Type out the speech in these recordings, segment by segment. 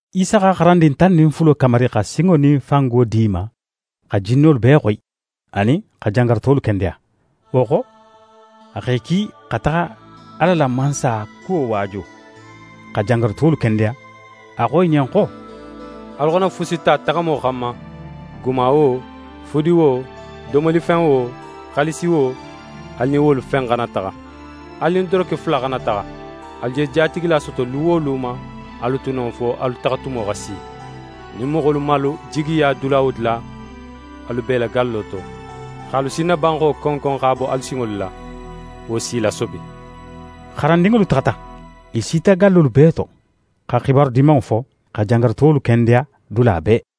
Isa xa xarandin tan nin fulo kamari xa sinŋo nin fango di i ma xa jinnolu bee xoyi, anin xa jangarutolu kendeya. Wo xo, a x'e ki xa taxa Ala la Mansaya kuwo waaju, xa jangarutolu kendeya. A xo i ɲen xo: «Alu xana fusi ta taxamo xanma, guma wo, fudi wo, domolifen wo, xaalisi wo, alu nin wolu fen xana taxa. Alu nin doroke fula xana taxa. Alu je jatigila soto lu wo lu ma, alu tu non fo alu taxatumo xa si. Nin moxolu man alu jigiya dula wo dula, alu bo i la gallo to, x'alu sinnabanxo konkon x'a bo alu sinŋolu la. Wo s'i lasobi.» Xarandinŋolu taxata. I sita gallolu bee to, xa xibaru Dimanŋo fo, xa jangarutolu kendeya dula bee.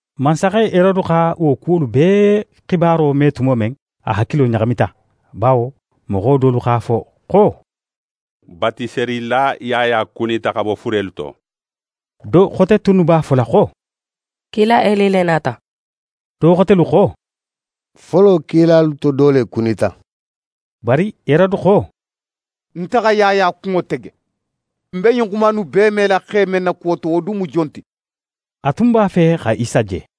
Mansaxe Herode xa wo kuwolu bee xibaro me tumo men, a hakilo ɲaxamita, bawo moxo dolu x'a fo xo: «Batiselila Yaya kunita xa bo furelu to.» Do xote tunnu b'a fola xo: «Kila Eli le nata.» Do xotelu xo: «Folo kilalu to do le kunita.» Bari Herode xo: «Nte xa Yaya kunŋo tege. Ń be ɲin xuma innu bee mela xe men na kuwo to, wo dun mu jon ti?» A tun b'a fe xa Isa je.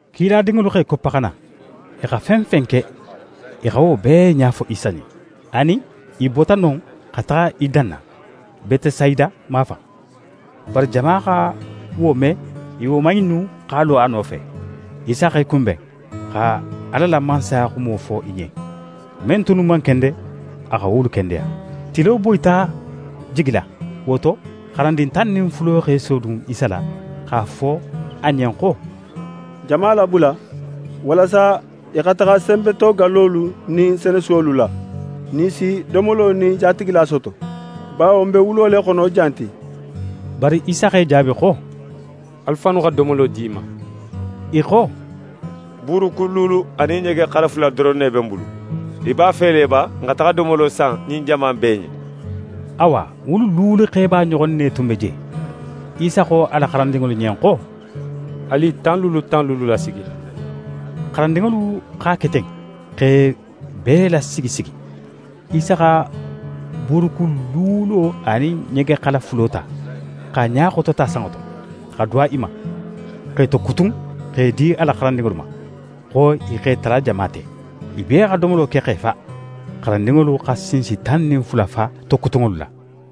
Kiladinŋolu x'e koppa xa na. I xa fen fen ke, i xa wo bee ɲa fo Isa ɲen. A nin i bota non, xa taxa i danna, Betesayida mafan. Bari jama xa wo me, i woman innu x'a lo a nofe. Isa x'e kunben, xa Ala la Mansaya xumo fo i ɲen. Men tunnu man kende, a xa wolu kendeya. Tilo boyita jigila; wo to xarandin tan nin fulo x'e sodun Isa la x'a fo a ɲen xo: «Jama labula walasa i xa taxa senbetogallolu nin senesuwolu la, nin i si domolo nin jatigila soto, bawo n be wulo le xono jan ti.» Bari Isa x'e jaabi xo: «Alu fannu xa domolo di i ma!» I xo: «Buurukun luulu anin ɲegexala fula doron ne be n bulu. Í b'a fe le ba n xa taxa domolo san ɲin jama in bee ɲen?» Awa, wulu luulu xeba ɲoxon ne tun be je. Isa xo a la xarandinŋolu ɲen xo: «Alu i tan luulu tan luulu lasigi.» Xarandinŋolu x'a ke ten, x'e bee lasigi sigi. Isa xa buurukun luulo anin ɲegexala fulo ta, x'a ɲa xotota sanŋo to, xa duwa i ma, x'e tokutun x'e di a la xarandinŋolu ma, xo i x'e tala jama te. I bee xa domolo ke x'e fa. Xarandinŋolu xa sinsi tan nin fula fa tokutunŋolu la.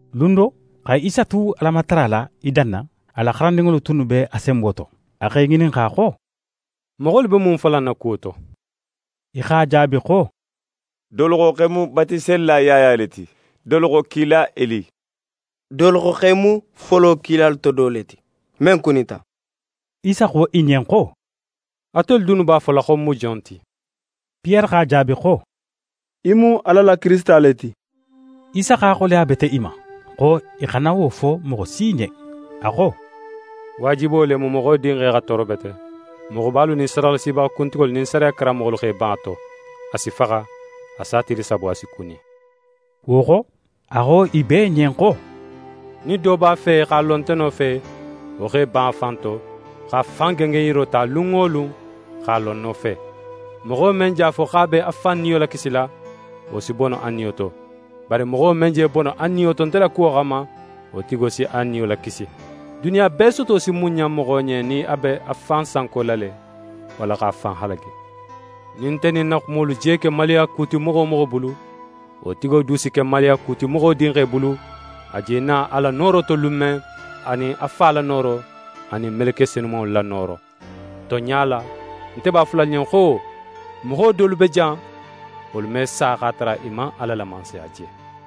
Lun do, xa Isa tu Alamatara la i danna, a la xarandinŋolu tunnu be a senbo to. A x'e ŋininxa xo: «Moxolu be mun fola ń na kuwo to?» I x'a jaabi xo: «Dolu xo x'é mu Batiselila Yaya le ti, dolu xo kila Eli, dolu xo x'é mu folo kilalu to do le ti, men kunita.» Isa xo i ɲen xo: «Atelu dunnu b'a fola xo ń mu jon ti?» Piyere x'a jaabi xo: «Í mu Ala la Kirisita le ti.» Isa x'a xoleya bete i ma, xo i xana wo fo moxo si ɲen. A xo: «Waajibo le mu Moxo Dinxe xa tooro bete; moxobalu nin sadaxalasibaxa kuntigolu nin sariya karanmoxolu x'e ban a to. A si faxa. A sa tili sabo, a si kuni.» Wo xo, a xo i bee ɲen xo: «Nin do b'a fe x'a lo nte nofe, wo x'é ban a fan to, x'a fan gengenyiro ta lun wo lun, x'a lo ń nofe. Moxo men je a fo xo a b'a fan niyo lakisila, wo si bono a niyo to. Bari moxo men je bono a niyo to nte la kuwo xanma, wo tigo si a niyo lakisi. Duniya bee soto si mun ɲan moxo ɲen, nin a be a fan sankola le, walla x'a fan halagi? Nin nte nin ń na xumolu je ke maluyaku ti moxo wo moxo bulu, wo tigo du si ke maluyaku ti Moxo Dinxe bulu, a je na a la nooro to lun men, anin a Fa la nooro anin meleke senumanŋolu la nooro. Tonɲa la, nte b'a fola alu ɲen xo, moxo dolu be jan, wolu me sa x'a tara i man Ala la Mansaya je.»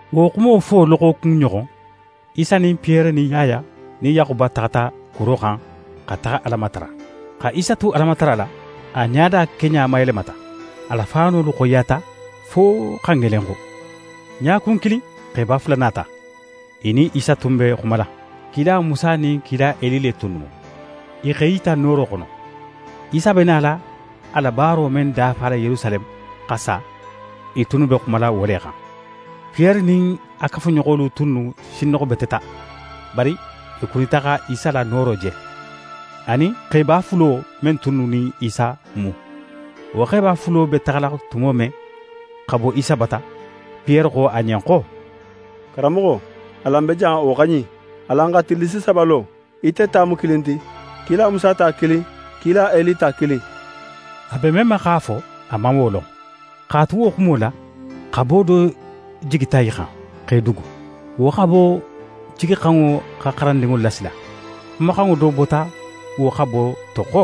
Wo xumo fo xo loxokun ɲoxon, Isa nin Piyere nin Yaya nin Yaxuba taxata kuro xan xa taxa Ala matara. Xa Isa tu Alamatara la, a ɲada keɲa mayelemata, a la faanolu xoyiyata fo xa ŋelenxu. Ɲakun kilin, xeba fula nata, i nin Isa tun be xumala: Kila Musa nin kila Eli le tunnu mu. I x'e yita nooro xono. Isa be nala a la baaro men dafala Yerusaleme, xa sa, i tunnu be xumala wo le xan. Piyere nin a kafuɲoxolu tunnu sinnoxobeteta, bari i kunita xa Isa la nooro je, a nin xeba fulo men tunnu nin Isa mu. Wo xeba fulo be taxala tumo men xa bo Isa bata, Piyere xo a ɲen xo: «Karanmoxo, alan be jan, wo xa ɲin. Alan xa tillisi saba lo, ite ta mu kilin ti, kila Musa ta kilin, kila Eli ta kilin.» A be men ma x'a fo, a man wo lon. X'a tu wo xumo la, xabo do jigita i xan, x'e dugu. Wo xabo jiginxanŋo xa xarandinŋolu lasila. Xumaxanŋo do bota wo xabo to xo: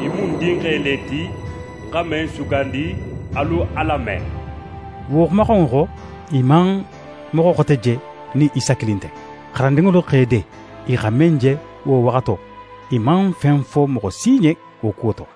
«Ɲin mu ń Dinxe le ti, ń xa men sugandi. Alu a lame!» Wo xumaxanŋo xo, i man moxo xote je nin Isa kilin nte. Xarandinŋolu x'e de; i xa men je, wo waxato, i man fen fo moxo si ɲen wo kuwo to.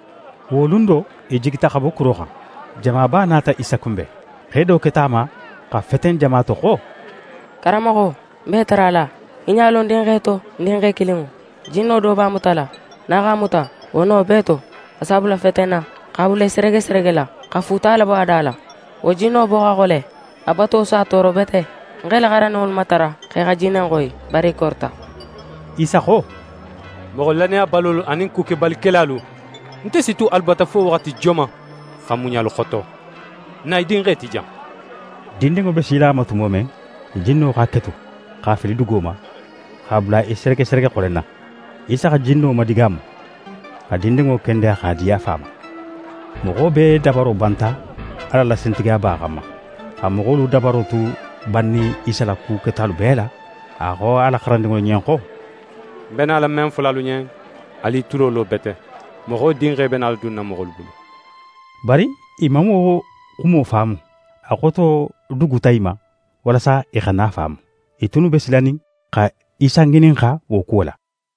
Wo lun do, i jigita xa bo kuro xan. Jamaba nata Isa kunben. Xe do keta a ma xa feten jama to xo: «Karanmoxo, ń b'é matarala, í ɲa lo ń dinxe to, ń dinxe kilinŋo. Jinno do b'a mutala. Nin a x'a muta, wo no bee to, a s'a bula fetenna, x'a bula í seregeseregela, xa fuuta labo a da la; wo jinno bo xa xole, a boto s'a tooro bete. Ń x'e la xarandinŋolu matara x'e xa jinne in xoyi, bari i korita.» Isa xo: «Moxo lannayabalolu anin kukebalikelalu, nte si tu alu bata fo waxati joman, xa muɲa alu xoto? Na í dinxe ti jan.» Dindinŋo be sila a ma tumo men, jinno x'a ketu, x'a fili dugo ma, x'a bula í seregeserege xolenna. Isa xa jinno madigaamu, xa dindinŋo kendeya x'a di a fa ma. Moxo bee dabaro banta Ala la sintigiyaba xanma. Xa moxolu dabaro tu bannin Isa la ku ketalu bee la, a xo a la xarandinŋolu ɲen xo: «Ń be nala men fola alu ɲen, alu i tulo lo bete: Moxo Dinxe be nala dunna moxolu bulu.» Bari i man wo xumo faamu. A xoto duguta i ma, walasa i xana a faamu. I tunnu be silanin xa Isa ŋininxa wo kuwo la.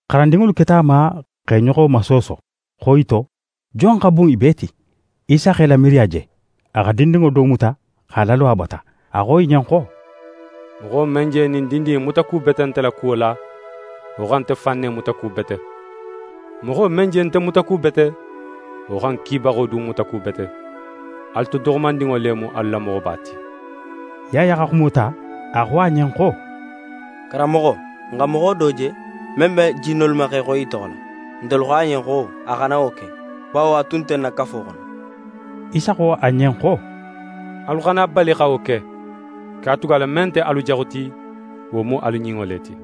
xarandinŋolu keta a ma x'e ɲoxo masooso, xo i to, jon xa bun i bee ti. Isa x'e la miiriya je. A xa dindinŋo do muta x'a lalo a bata. A xo i ɲen xo: «Moxo men je ɲin dindin in mutakubete nte la kuwo la, wo xa nte fan ne mutakubete. Moxo men je nte mutakubete, wo xa ń Kibaxo du mutakubete. Alu to doxomandinŋo le mu alu la moxoba ti.» Yaya xa xumo ta, a xo a ɲen xo: «Karanmoxo, n xa moxo do je, men be jinnolu ma x'e xoyi í toxo la. Ntelu xo a ɲen xo a xana wo ke, bawo a tun nte n na kafo xono.» Isa xo a ɲen xo: «Alu xana a bali xa wo ke, katugala men nte alu jaxu ti, wo mu alu ɲinŋo le ti.»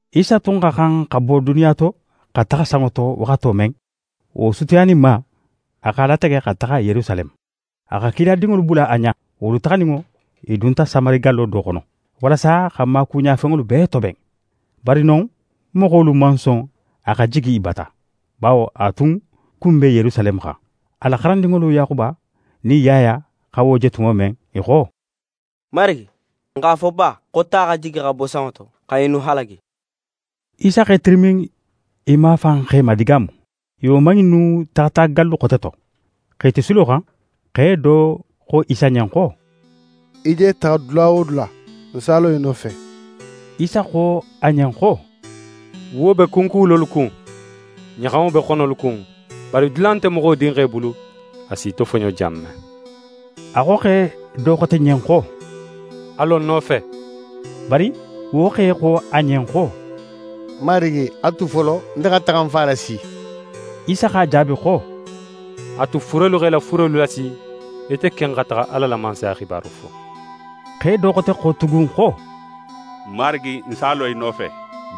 Isa tun xa xan xa bo duniya to xa taxa sanŋo to waxato men, wo sutiyaninma, a x'a latege xa taxa Yerusaleme. A xa kiladinŋolu bula a ɲa. Wolu taxaninŋo, i dunta Samari gallo do xono, walasa x'a maakuɲanfenŋolu bee toben. Bari non moxolu man son a xa jigi i bata, bawo a tun kun be Yerusaleme xan. A la xarandinŋolu Yaxuba nin Yaya xa wo je tumo men, i xo: «Marigi, n x'a fo ba xo ta xa jigi xa bo sanŋo to xa ɲinnu halagi?» Isa x'é tirimin i mafan x'e madigaamu. I woman innu taxata gallu xote to. X'e tu silo xan, xe do xo Isa ɲen xo: «Í je taxa dula wo dula, ń s'a lo í nofe.» Isa xo a ɲen xo: «Wuwo be kunkuwulolu kun, ɲaxanŋo be xonolu kun, bari dula nte Moxo Dinxe bulu, a s'í tofoɲo jan men.» A xo xe do xote ɲen xo: «A lo ń nofe!» Bari wo xe xo a ɲen xo: «Marigi, a tu folo, nte xa taxa ń fa lasi.» Isa x'a jaabi xo: «A tu furelu x'e la furelu lasi, ite ken xa taxa Ala la Mansaya xibaro fo.» Xe do xote xo tugun xo: «Marigi, ń s'a lo í nofe,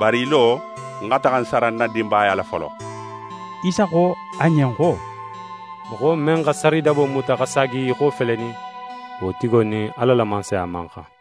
bari í lo ń xa taxa ń sara ń na dinbaya la folo.» Isa xo a ɲen xo: «Moxo men xa saridabo muta, xa saagi í xo felenin, wo tigo nin Ala la Mansaya man xan.»